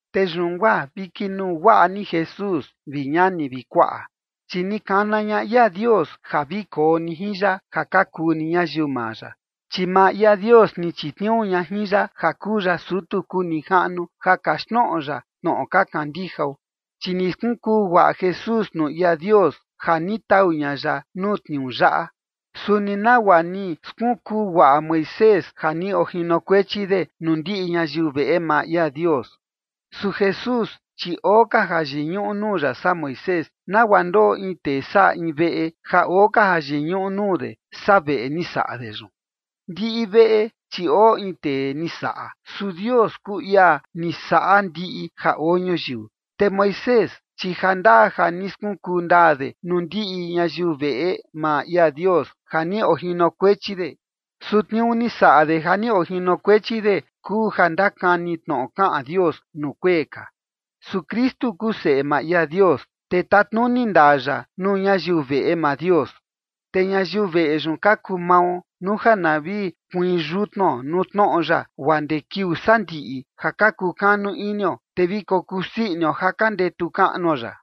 Te yun guaa vi kinuu guaꞌa ni Jesús, vi ñani vi kuaꞌa, chi ni kana ña ia Dios ja vi koo ni jin ya, ja ka kuu ni ñayiu maa ya, chi maa ia Dios ni chitniuu ña jin ya ja kuu ya sutu kuu nijaꞌnu ja kaxtnoꞌo ya tnoꞌo ka kandijao. Chi ni skunkuu guaꞌa Jesús nuu ia Dios ja ni tau ña ya nuu tniuu yaꞌa, suni nagua ni skunkuu guaꞌa Moisés ja ni ojinokuechi de nuu ndiꞌi ñayiu veꞌe maa ia Dios. Su Jesús, chi oo ka ja yiñuꞌu nuu ya saa Moisés, nagua ndoꞌo in tee saꞌa in veꞌe ja oo ka jayiñuꞌu nuu de, saa veꞌe ni saꞌa de yun. Ndiꞌi veꞌe, chi oo in tee ni saꞌa, su Dios kuu ia ni saꞌa ndiꞌi ja oo ñuyiu. Te Moisés, chi jandaa ja ni skunkuu ndaa de nuu ndiꞌi ñayiu veꞌe maa ia Dios ja ni ojinokuechi de. Su tniuu ni saꞌa de ja ni ojinokuechi de kuu ja ndakani tnoꞌo kaꞌan Dios nuu kuee ka. Su Kristu kuu Seꞌe maa ia Dios, te tatnuni ndaa ya nuu ñayiu veꞌe maa Dios, te ñayiu veꞌe yun ka kuu mao, nuu ja na vi kuiin yutnuo nuu tnoꞌo ya guaa ndee kiuu sandiꞌi ja ka kukanu inio, te vi kokusii inio ja ka ndetu kaꞌnuo ya.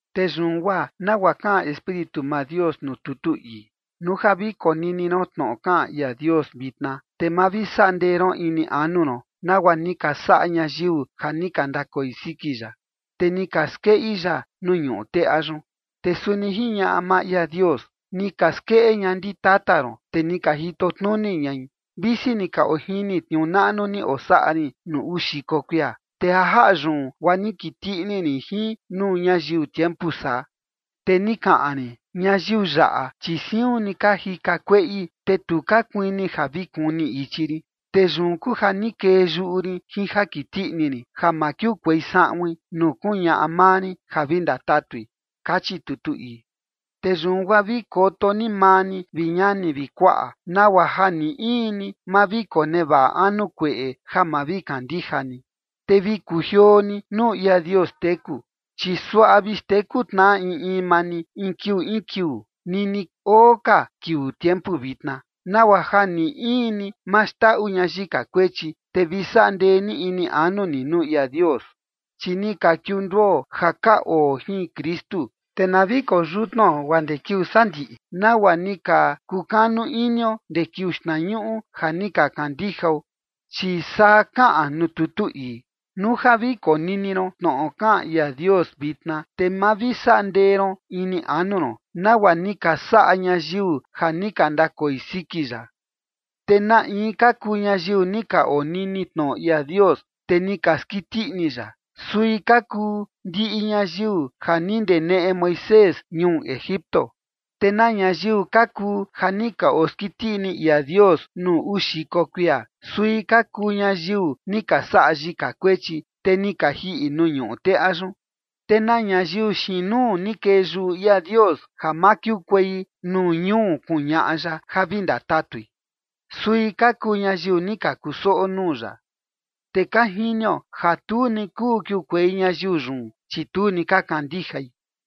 Te yun guaa nagua kaꞌan Espíritu maa Dios nuu tutu ii: Nuu ja vi konini ron tnoꞌo kaꞌan ia Dios vitna, te ma vi saꞌa ndee ron ini anu ron, nagua ni ka saꞌa ñayiu ja ni ka ndakoi siki ya, te ni ka skeꞌi ya nuu ñuꞌu teꞌa yun. Te suni jiñaꞌa maa ia Dios: Ni ka skeꞌe ña ndi tata ron, te ni ka jito tnuni ñai, visi ni ka ojini tniuu naꞌnu ni osaꞌa rin nuu uu xiko kuia. Te ja jaꞌa yun guaa ni kiti ini rin jin nuu ñayiu tiempu saa, te ni kaꞌan rin: “Ñayiu yaꞌa, chi siun ni ka jika kueꞌi, te tu ka kuini ja vi kuni ichi rin”. Te yun kuu ja ni kee yuꞌu rin jin ja kiti ini rin ja ma kiukuei saꞌuin nuu kuñaꞌa maa rin ja vi ndatatui, kachi tutu ii. Te yun guaa vi koto ni maa ni, vi ñani vi kuaꞌa, nagua ja ni in ni ma vi konevaꞌa anu kueꞌe ja ma vi kandija ni, te vi kujioo ni nuu ia Dios teku. Chi suaꞌa vi xteku tnaꞌa in in maa ni in kiuu in kiuu, nini oo ka kiuu tiempu vitna, nagua ja ni in ni ma xndaꞌu ña yika kuechi, te vi saꞌa ndee ni ini anu ni nuu ia Dios. Chi ni ka kiunduo ja ka oo jin Kristu, te na vi koo yutnuo guaa ndee kiuu sandiꞌi, nagua ni ka kukanu inio ndee kiuu xtnañuꞌu ja ni ka kandijao. Chi saa kaꞌan nuu tutu ii: Nuu ja vi konini ron tnoꞌo kaꞌan ia Dios vitna, te ma vi saꞌa ndee ron ini anu ron, nagua ni ka saꞌa ñayiu ja ni ka ndakoi siki ya. ¿Te na in ka kuu ñayiu ni ka onini tnoꞌo ia Dios, te ni ka skiti ini ya? Sui ka kuu ndiꞌi ñayiu ja ni ndeneꞌe Moisés ñuu Egipto. ¿Te na ñayiu ka kuu ja ni ka oskiti ini ia Dios nuu uu xiko kuia? Sui ka kuu ñayiu ni ka saꞌa yika kuechi, te ni ka jiꞌi nuu ñuꞌu teꞌa yun. ¿Te na ñayiu xiin nuu ni kee yuꞌu ia Dios ja ma kiukuei nuu ñuu kuñaꞌa ya ja vi ndatatui? Sui ka kuu ñayiu ni ka kusoꞌo nuu ya. Te ka jinio ja tu ni kuu kiukuei ñayiu yun, chi tu ni ka kandijai.